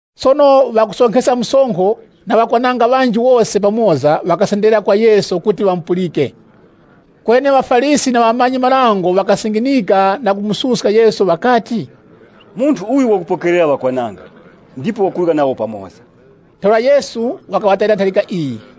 Sono ŵakusonkheska msonkho na ŵakwananga ŵanji, wose pamoza ŵakasenderera kwa Yesu kuti ŵamupulike. Kweni ŵaFarisi na ŵamanyi-marango ŵakasinginika na kumususka Yesu ŵakati, “Munthu uyu wakupokerera ŵakwananga, na kurya nawo pamoza.” Ntheura Yesu wakaŵatayira ntharika iyi: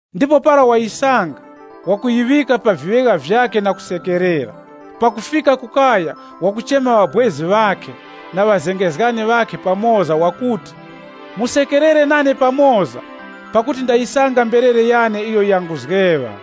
Ndipo para wayisanga, wakuyiŵika pa viŵegha vyakhe na kusekerera. Pakufika ku kaya wakuchema ŵabwezi ŵakhe na ŵazengezgani ŵakhe pamoza wakuti, ‘Musekerere nane pamoza, pakuti ndayisanga mberere yane iyo yanguzgeŵa.’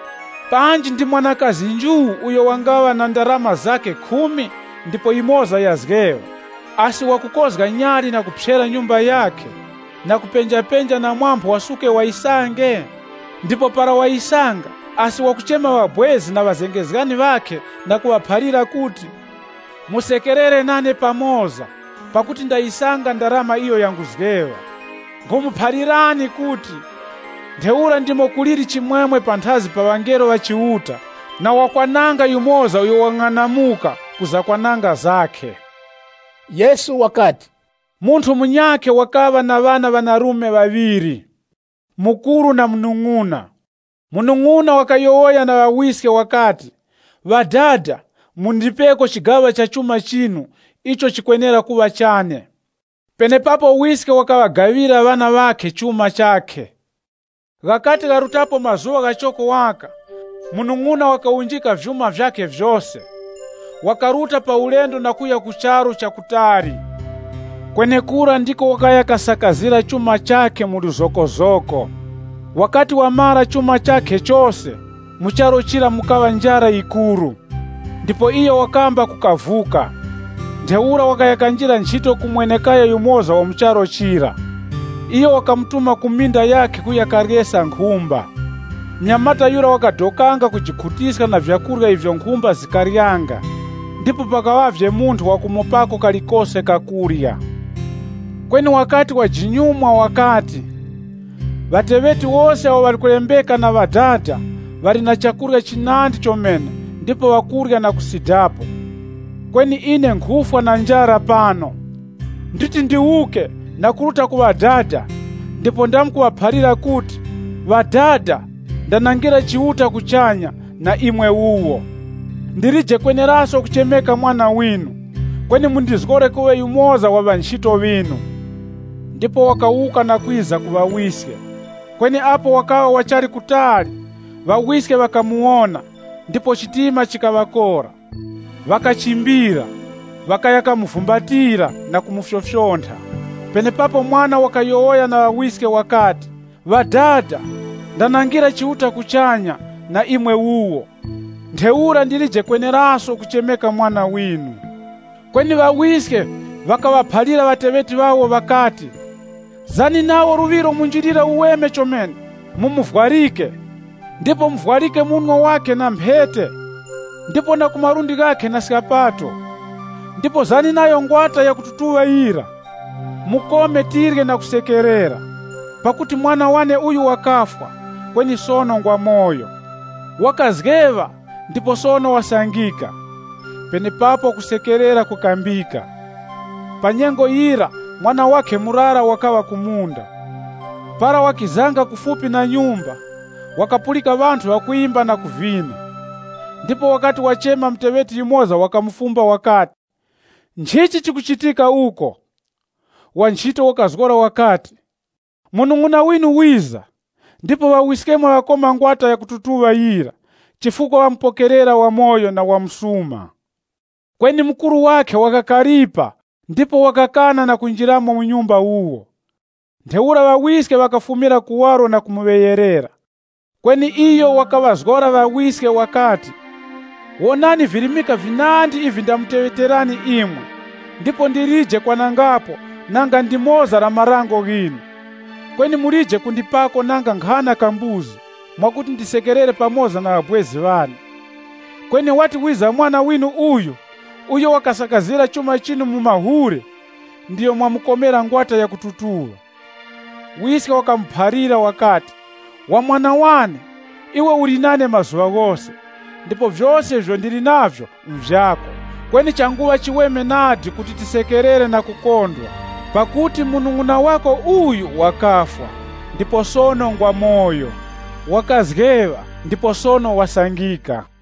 “Panji ndi mwanakazi nju uyo wangaŵa na ndarama zakhe khumi ndipo yimoza yazgeŵa, asi wakukozga nyali na kuphyera nyumba yakhe, na kupenjapenja na phamphu wasuke wayisange? Ndipo para wayisanga, asi wakuchema ŵabwezi na ŵazengezgani ŵakhe na kuŵaphalira kuti, ‘Musekerere nane pamoza, pakuti ndayisanga ndarama iyo yanguzgeŵa.’ Nkhumuphalirani kuti, ntheura ndimo kuliri chimwemwe panthazi pa ŵangelo ŵa Chiuta na wakwananga yumoza uyo wang'anamuka ku zakwananga zakhe.” Yesu wakati, “Munthu munyakhe wakaŵa na ŵana ŵanarume ŵaŵiri, mukuru na munung'una. Munung'una wakayowoya na ŵawiske wakati, ‘Ŵadada, mundipeko chigaŵa cha chuma chinu icho chikwenera kuŵa chane.’ Penepapo wiske wakaŵagaŵira ŵana ŵakhe chuma chakhe. Ghakati gharutapo mazuŵa ghachoko waka, munung'una wakawunjika vyuma vyakhe vyose, wakaruta pa ulendo na kuya ku charu cha kutali. Kwenekura ndiko wakaya kasakazira chuma chakhe mwa wuchindere. Wakati wamara chuma chakhe chose, mu charu chira mukaŵa njara yikuru. Ndipo iyo wakamba kukavuka. Ntheura wakaya kanjira nchito ku mwene-kaya yumoza wa mu charu chira. Iyo wakamutuma ku minda yakhe kuya karyeska nkhumba. Munyamata yura wakadokanga kujikhutiska na vyakurya ivyo nkhumba zikaryanga, ndipo pakaŵavye munthu wakumupako kalikose kakurya. Kweni wakati wajinyumwa wakati, ‘Ŵateŵeti wose awo ŵali kulembeka nchito na ŵadada, ŵali na chakurya chinandi chomene ndipo ŵakurya na kusidapo, kweni ine nkhufwa na njara pano! Nditi ndiwuke na kuruta ku ŵadada ndipo ndamkuŵaphalira kuti, “Ŵadada, ndanangira Chiuta kuchanya, na imwe wuwo. Ndilije kweneraso kuchemeka mwana winu, kweni mundizgore kuŵa yumoza wa ŵanchito ŵinu.” ’ Ndipo wakawuka na kwiza ku ŵawiske. “Kweni apo wakaŵa wachali kutali, ŵawiske ŵakamuwona, ŵakaŵa nayo na chiwuravi, ndipo ŵakachimbira, ŵakaya kamuvumbatira, na kumufyofyontha. Penepapo mwana wakayowoya na ŵawiske wakati, ‘Ŵadada ndanangira Chiuta kuchanya, na imwe wuwo. Ntheura ndilije kweneraso kuchemeka mwana winu.’ Kweni ŵawiske ŵakaŵaphalira ŵateŵeti ŵawo ŵakati, ‘Zani nawo luŵiro munjilira uweme chomene, mumuvwarike. Ndipo muvwarike munwe wakhe na mphete, ndipo na ku malundi ghakhe na skapato. Ndipo zani nayo ngwata yakututuŵa yira, mukome tirye na kusekerera. Pakuti mwana wane uyu wakafwa, kweni sono ngwamoyo. Wakazgeŵa, ndipo sono wasangika!’ Penepapo kusekerera kukambika. “Pa nyengo yira, mwana wakhe murara wakaŵa ku munda. Para wakizanga kufupi na nyumba, wakapulika ŵanthu ŵakwimba na kuvina. Ndipo wakati wachema muteŵeti yumoza wakamufumba wakati, ‘Nchichi chikuchitika uko?’ Wa nchito wakazgora wakati, ‘Munung'una winu wiza, ndipo ŵawiskemwe ŵakoma ngwata yakututuŵa yira chifukwa ŵamupokerera wamoyo na wa msuma.’ “Kweni mukuru wakhe wakakaripa ndipo wakakana na kunjiramo mu nyumba wuwo. Ntheura ŵawiske ŵakafumira kuwaro na kumuŵeyerera. Kweni iyo wakaŵazgora ŵawiske wakati, ‘Wonani virimika vinandi ivi ndamuteŵeterani imwe ndipo ndilije kwanangapo nanga ndimoza la marango ghinu. Kweni mulije kundipako nanga nkhana ka mbuzi, mwakuti ndisekerere pamoza na ŵabwezi ŵane. Kweni wati wiza mwana winu uyu, uyo wasakazira chuma chinu mu mahule, ndiyo mwamukomera ngwata yakututuŵa.’ Wiske wakamuphalira wakati, ‘Wa mwana wane, iwe uli nane mazuŵa ghose, ndipo vyose ivyo ndili navyo nvyako. Kweni changuŵa chiweme nadi kuti tisekerere na kukondwa, pakuti munung'una wako uyu wakafwa, ndipo sono ngwamoyo. Wakazgeŵa, ndipo sono wasangika.’”